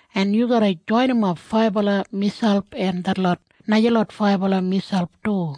en yu garra joinimap faibala miselp en detlot najalot faibala miselp du.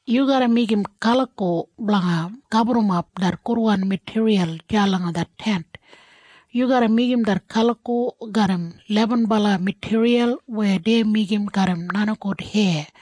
“Yu garra meigim kaliko blanga gaburrumap det gudwan matiriyal deya langa det Tent. Yu garra meigim det kaliko garram lebenbala matiriyal weya dei meigim garram nenigout heya.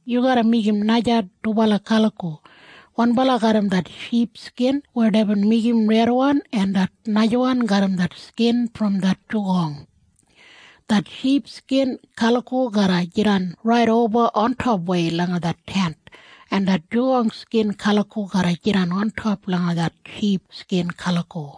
“Yu garra meigim naja dubala kaliko, wanbala garram det ship skin weya deibin meigim redwan en det najawan garram det skin brom det nenigout. Det ship skin kaliko garra jidan raidoba ontopwei langa det Tent, en det nenigout skin kaliko garra jidan ontop langa det ship skin kaliko.”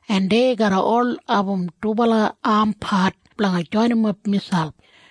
en dei garra ol abum dubala ampat blanga joinimap miselp.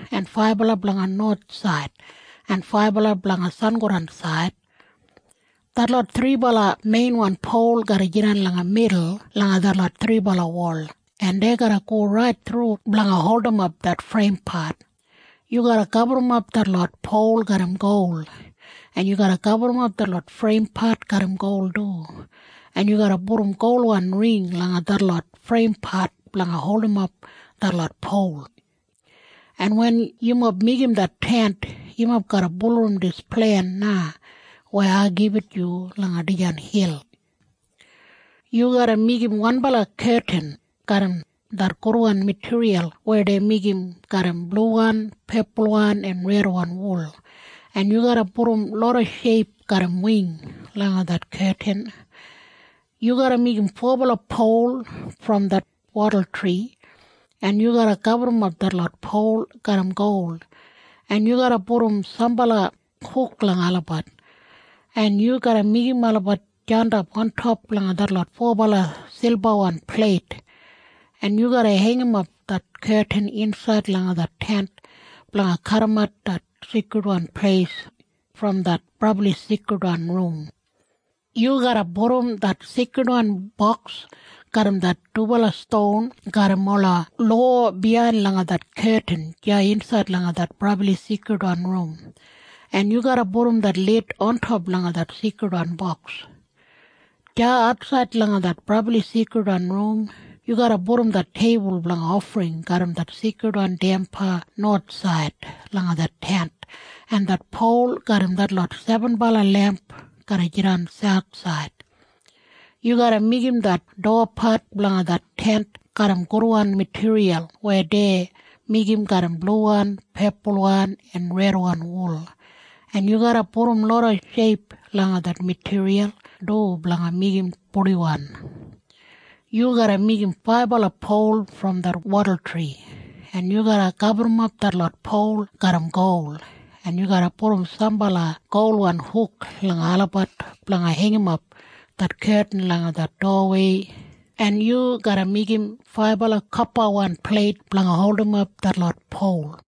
en faibala blanga nowathsaid en faibala blanga sangodansaid. Detlot thribala meinwan pol garra jidan langa midul langa detlot thribala wol, en dei garra go rait thru blanga holdimap det freimpat. Yu garra gaburrumap detlot pol garram gol, en yu garra gaburrumap detlot freimpat garram gol du, en yu garra pudum golwan ring langa detlot freimpat blanga holdimap detlot pol. En wen yumob meigim det Tent, yumob garra bulurrum dis plen na weya ai gibit yu langa dijan hil. “Yu garra meigim wanbala ketin garram det gudwan matiriyal weya dei meigim garram bluwan, pepulwan en redwan wul, en yu garra pudum loda sheip garram wing langa det ketin. Yu garra meigim fobala pol brom det wadultri, en yu garra gaburrumap detlot pol garram gol, en yu garra pudum sambala huk langa olabat, en yu garra meigim olabat jandap ontop langa detlot fobala silbawan pleit, en yu garra heingimap det ketin insaid langa det Tent blanga kadimat det Seikridwan Pleis brom det Brabli Seikridwan Rum. Yu garra pudum det Seikridwan Boks garram det dubala ston garram ola lowa biyain langa det ketin deya insaid langa det Brabli Seikridwan Rum, en yu garra pudum det lid ontop langa det Seikridwan Boks. Deya atsaid langa det Brabli Seikridwan Rum yu garra pudum det teibul blanga ofring garram det seikridwan damba nowathsaid langa det Tent, en det pol garram detlot sebenbala lemp garra jidan sauthsaid. “Yu garra meigim det dowapat blanga det Tent garram gudwan matiriyal weya dei meigim garram bluwan, pepulwan en redwan wul, en yu garra pudum loda sheip langa det matiriyal du blanga meigim purdiwan. Yu garra meigim faibala pol brom det wadultri, en yu garra gaburrumap detlot pol garram gol, en yu garra pudum sambala golwan huk langa olabat blanga heingimap det ketin langa det dowawei, en yu garra meigim faibala kopawan pleit blanga holdimap detlot pol.”